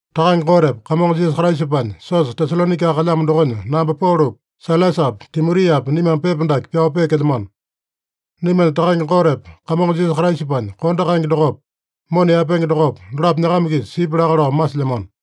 Takange Gotepa Kamongo Jisasa Kraisapanya siosa Tesalonaika kalyamo dokonya namba Polopi, Sailasapi, Timotiapi, naimame pepa dake pyao peekelyamano. Naimanya Takange Gotepa Kamongo Jisasa Kraisapanya kondo kaenge dokopa, mona yaepenge dokopa, dolapo nyakama-kisa sipya laka lao masilyamano.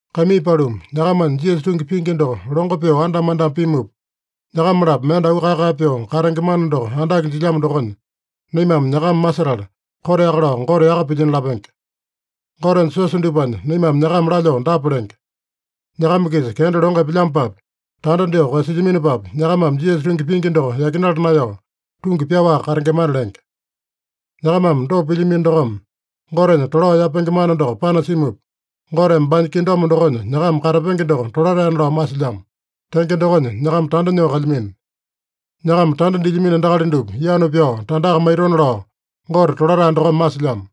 Kaimii paluma, nyakamanya Jisasa tungi pingi doko longo pyoo andama-andama pimupa, nyakama-lapo mende auu kae-kae pyoo katenge mana doko andake jilyamo dokonya, naimame nyakama masetala, koteaka lao Gote yaka pilyino lapenge. Gotenya siosa dupanya naimame nyakama lalyoo dapa lenge: Nyakama-kisa kenda longo epelyamopapi, tanda dyoo koeyasilyaminopapi, nyakamame Jisasa tungi pingi doko yakinala naeyao, tungi pyaowaka katengemana lenge. Nyakamame dopa pilyamino dokome, Gotenya tolao yapenge mana doko panasimupa, Goteme baanya kingdom dokonya nyakama katapenge doko tolataena lao masilyamo. Tenge dokonya nyakama tanda nyoo kalyamino. Nyakama tanda dilyamino endakali dupa yanu pyao tandaka maitona lao Gote tolatae dokome masilyamo.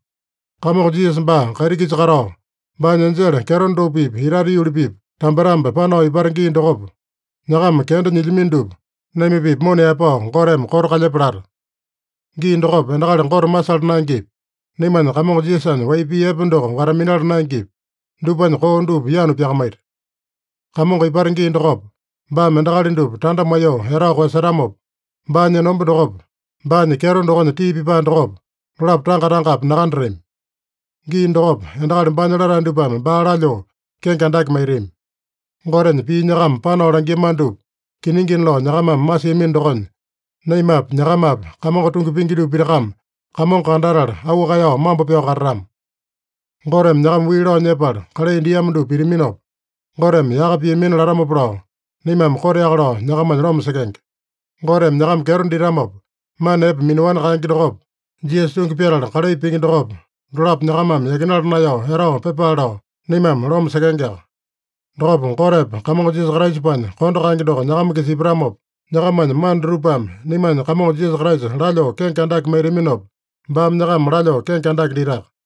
Kamongo Jisasa baa kaiti-kisa katao, baanya enjele kyeto dupa-pipa itate yuli-pipa tambetambe panao ipata gii dokopa, nyakama kenda nyilyamino dupa naima-pipa mona yaepao Goteme koto kalyepa lata. Gii dokopa endakali Gote masala naengepi, naimanya Kamongo Jisasanya wai pii epe doko wata-minala naengepi, dupanya koo dupa yanu pyakamaita. Kamongo ipata gii dokopa, baame endakali dupa tanda maiyoo etao koeyasetamopa, baanya enomba dokopa, baanya kyeto dokonya tii pipae dokopa, dolapo tanga-tangapi nakandatami. Gii dokopa, endakali baanya latae dupame baa lalyoo kenge andake maitami. Gotenya pii nyakama panao langiamano dupa kiningina lao nyakamame masiamino dokonya, naimapi, nyakamapi Kamongo tungi pingi dupa pitakame Kamongo kandatala, auu kaeyao mambo pyao katatama. Goteme nyakama wii lao nyepala kalai diamo dupa pitaminopa, Goteme yaka piamina latamopa lao, naimame koteaka lao nyakamanya loma sekenge. Goteme nyakama kyeto ditamopa, mana epe minaowani kaenge dokopa, Jisasa tungi pyatala kalai pingi dokopa, dolapo nyakamame yakinala naeyao etao pyepale lao, naimame loma sekengeaka. Dokopa Gotepa Kamongo Jisasapanya kondo kaenge doko nyakama-kisa ipatamopa, nyakamanya mana dutupame naimanya Kamongo Jisasa Kraisa lalyoo kenge andake maitaminopa, baame nyakama lalyoo kenge andake ditaka.